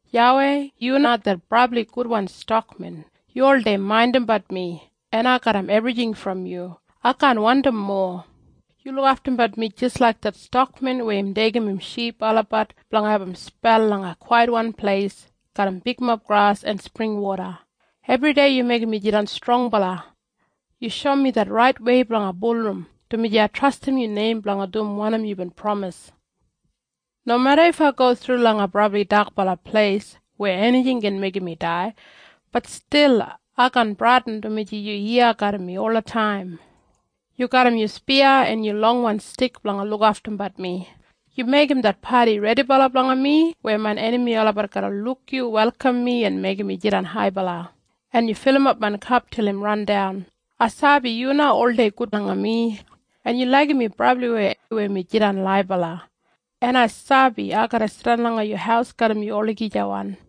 YAWEI, yu na det brabli gudwan stakmen. Yu oldei maindimbat mi, en ai garram ebrijing brom yu. Ai kaan wandim mowa. Yu lukaftumbat mi jis laik det stakmen weya im deigim im ship olabat blanga abum spel langa kwaitwan pleis garram bigmob gras en springwoda. Ebridei yu meigim mi jidan strongbala. Yu shoum mi det raitwei blanga bulurrum, dumaji ai trastim yu neim blanga dum wanim yubin pramis. Nomeda if ai go thru langa brabli dakbala pleis weya enijing gin meigim mi dai, bat stil ai kaan bradin dumaji yu iya garram mi olataim. Yu garram yu spiya en yu longwan stik blanga lukaftumbat mi. Yu meigim det padi redibala blanga mi, weya main enami olabat garra luk yu welkam mi en meigim mi jidan haibala, en yu filimap main kap til im randan. Ai sabi yu na oldei gud langa mi, en yu laigim mi brabliwei weya mi jidan laibala. En ai sabi ai garra jidan langa yu haus garram yu olagijawan.